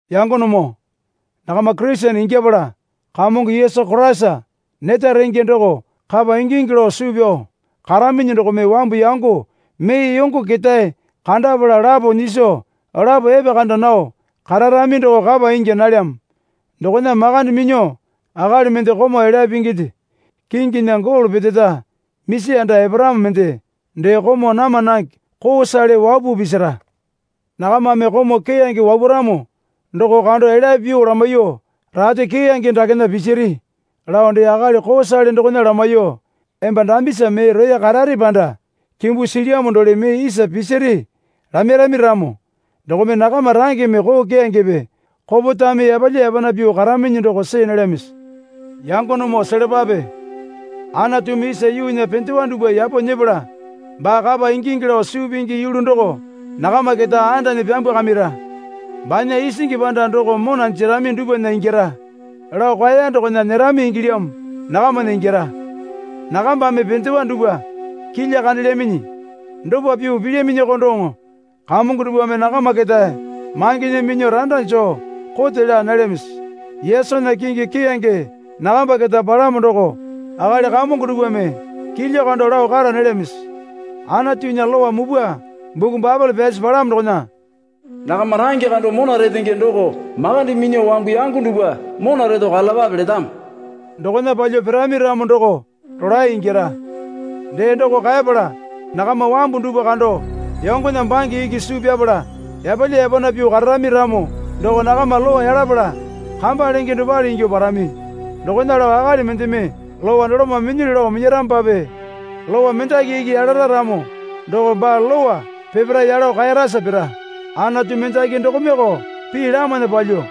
Yangonemoo, nakama Kurisene ingyapala Kamongo Yesu Koraisa neta renge doko kapa ingingi lao suu pyao karaminyi dokome wambu yango mee yongo ketae kandapala lapo nyiso lapo epekanda nao kararami doko kapa ingya nalyamo. Dokona makande minyuo akali mende komau elyape pinginde kinginya golo peteta misi anda eparamo mende dee komau nama nange koosale wapuo pisira. Nakamame komau keyange wapuramo doko kando elya pyuo lamaiyuo, Rate keyange dakena pisiri lao dee akali koosale dokona lamaiyuo, Emba dambisa mee roya karare panda kimbu silyamo dole mee isa pisiri lamairami ramo dokome nakama rangeme koo keyangepe kopetame yapalya yapana pyuo karaminyi doko see nalyamisi? Yangonemoo selapape. Anatumi isa yuunya pendewa dupwa yapo nyepala baa kapa ingingi lao suu pingi yulu doko nakama keta andanyi pyambwakamira. Banya isingi panda doko mona jerami dupwana ingyara lao kaeya dokona nyerami ingilyamo nakamana ingyara. Nakambame pendewa dupwa kilya kandelyaminyi. Dopa pyuo pilyaminyoko doŋo kamongo dupwame nakama keta mangena minyuo randa joo kote laa nalyamisi? Yesunya kingi keyange nakamba keta palamo doko akali kamongo dupwame kilya kando lao kara nalyamisi? Anatunya lowa mupwa buku Baepole pyasi palamo dokona, Nakama range kando mona retenge doko makande minyuo wambu yango dupwa mona reto karalapape letamo. Dokona palyuo pirami ramo doko rolae ingyara. Dee doko kaepala nakama wambu dupwa kando yongona bange iki suu pyapala yapalya yapana pyuo kararami ramo doko nakama Lowa yalapala kamba lenge dopale ingyuo parami. Dokona lao akali mendeme Lowa doloma minyilyu lao minyaramopape Lowa mendaki iki yalara ramo doko baa Lowa peparae yalo kaerasa pira. Anatu mendaki dokomeko pii lamana palyuo,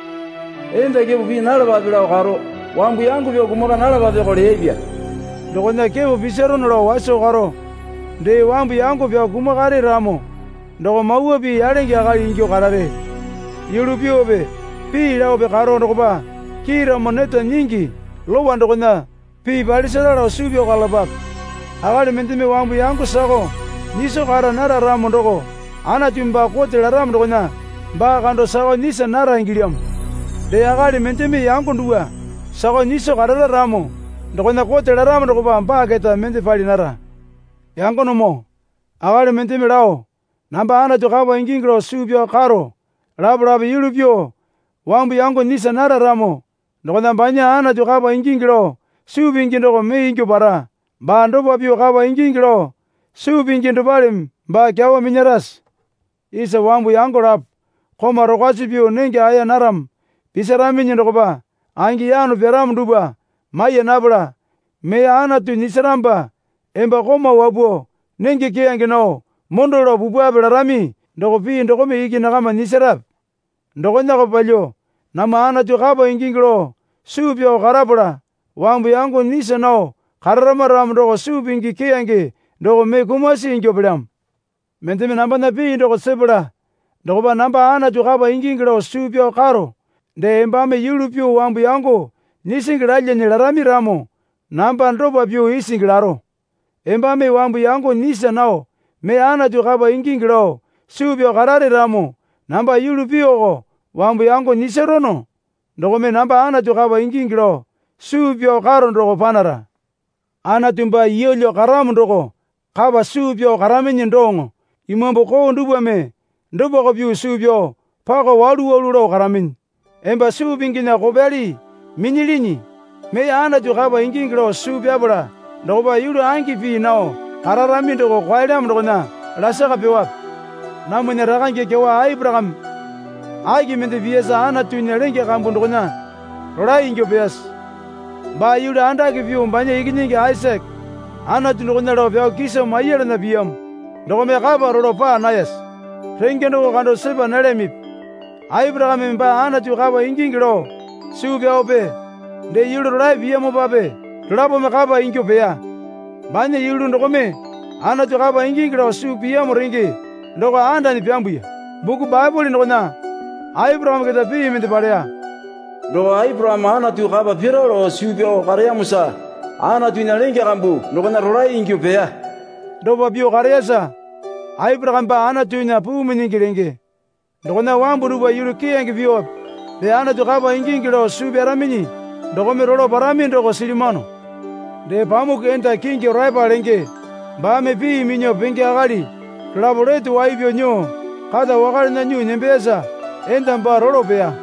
Enda kepo pii nalapape lao karo, Wambu yango pyao kumaka nalapapeko leyapya. Dokona kepo pisarono lao waso karo dee wambu yango pyao kumakare ramo doko mawa pii yalenge akali ingyuo karare. Yulu pyuope pii laope karo dokopa kiiramo neta nyingi lowa dokona pii palisara lao suu pyao karalapape. Akali mendeme wambu yango sakao nyiso kara nara ramo doko Anatumi baa kote laramo dokona baa kando sakao nyisa nara ingilyamo. Dee akali mendeme yango dupwa sakao nyiso karara ramo dokona kote laramo dokopa baa keta mende pali nara. Yangonemoo akali mendeme lao, Namba Anatu kapa ingingi lao suu pyao karo lapalape yulu pyuo wambu yango nyisa nara ramo dokona banya Anatu kapa ingingi lao suu pingi doko mee ingyuo para. Baa dopa pyuo kapa ingingi lao suu pingi dopaleme baa kyawa minyarase? Isa wambu yango lapo komau rokwasi pyuo nenge aya naramo, pisiraminyi dokopa angi yano piramo dupwa maiya napala, Mee Anatu nyisaramopa emba komau wapuo nenge keyange nao mondo lao pupwape larami doko pii dokome iki nakama nyisarape? Dokonako palyuo namwa Anatu kapa ingingi lao suu pyao karapala wambu yango nyisa nao kararama ramo doko suu pingi keyange doko mee kumasi ingyuo pelyamo. Mendeme nambana pii doko sepala dokopa, Namba Anatu kapa ingingi lao suu pyao karo dee embame yulu pyuo wambu yango nyisingi lalyane larami ramo namba dopa pyuo isingi laro. Embame wambu yango nyisa nao mee Anatu kapa ingingi lao suu pyao karare ramo namba yulu pyuoko wambu yango nyisarono dokome namba Anatu kapa ingingi lao suu pyao karo doko panara. Anatu baa yeelyo karamo doko kapa suu pyao karaminyi doŋo imambu koo dupwame dopako pyuo suu pyao pako walu walu lao karaminyi. Emba suu pinginya kopyali minyilyinyi. Mee Anatu kapa ingingi lao suu pyapala dokopa yulu angi pii nao kararami doko kwaelyamo dokona lasaka pyuowape? Namwana rakange kyawa Aporakame aki mende piyasa Anatunya lenge kambu dokona rolae ingyuo peyase? Baa yulu andake pyuo banya ikinyingi Aisake Anatu dokona lao pyao kiso maiyalana piyamo dokome kapa rolo paa nayase? Renge doko kando sepa nalyamipi? Aporakame baa Anatu kapa ingingi lao suu pyaope dee yulu rolae piyamopape dolapome kapa ingyuo peya. Banya yulu dokome Anatu kapa ingingi lao suu piyamo renge doko andanyi pyambuya. Buku Baepole dokona Aporakame keta pii mende paleya. Doko Aporakame Anatu kapa pira lao suu pyao kareyamosa Anatunya lenge kambu dokona rolae ingyuo peya. Dopa pyuo kareyasa, Aporakame baa Anatunya puu minyingi lenge. Dokona wambu dupwa yulu keyange pyuope dee Anatu kapa ingingi lao suu pyaraminyi dokome rolo parami doko silyamano. Dee pamuku enda kingi Oreapa lenge baame pii minyuo penge akali dolapo lete wai pyao nyuo kata wakalena nyuo nembeyasa enda baa rolo peya.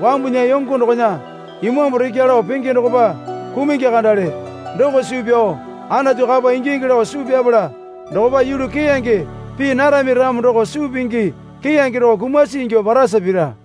Wambunya yongo dokona imambu rekya lao penge dokopa kumungi kandale doko suu pyao Anatu kapa ingingi lao suu pyapala dokopa yulu keyange pii narami ramo doko suu pingi keyange doko kumasi ingyuo parasa pira.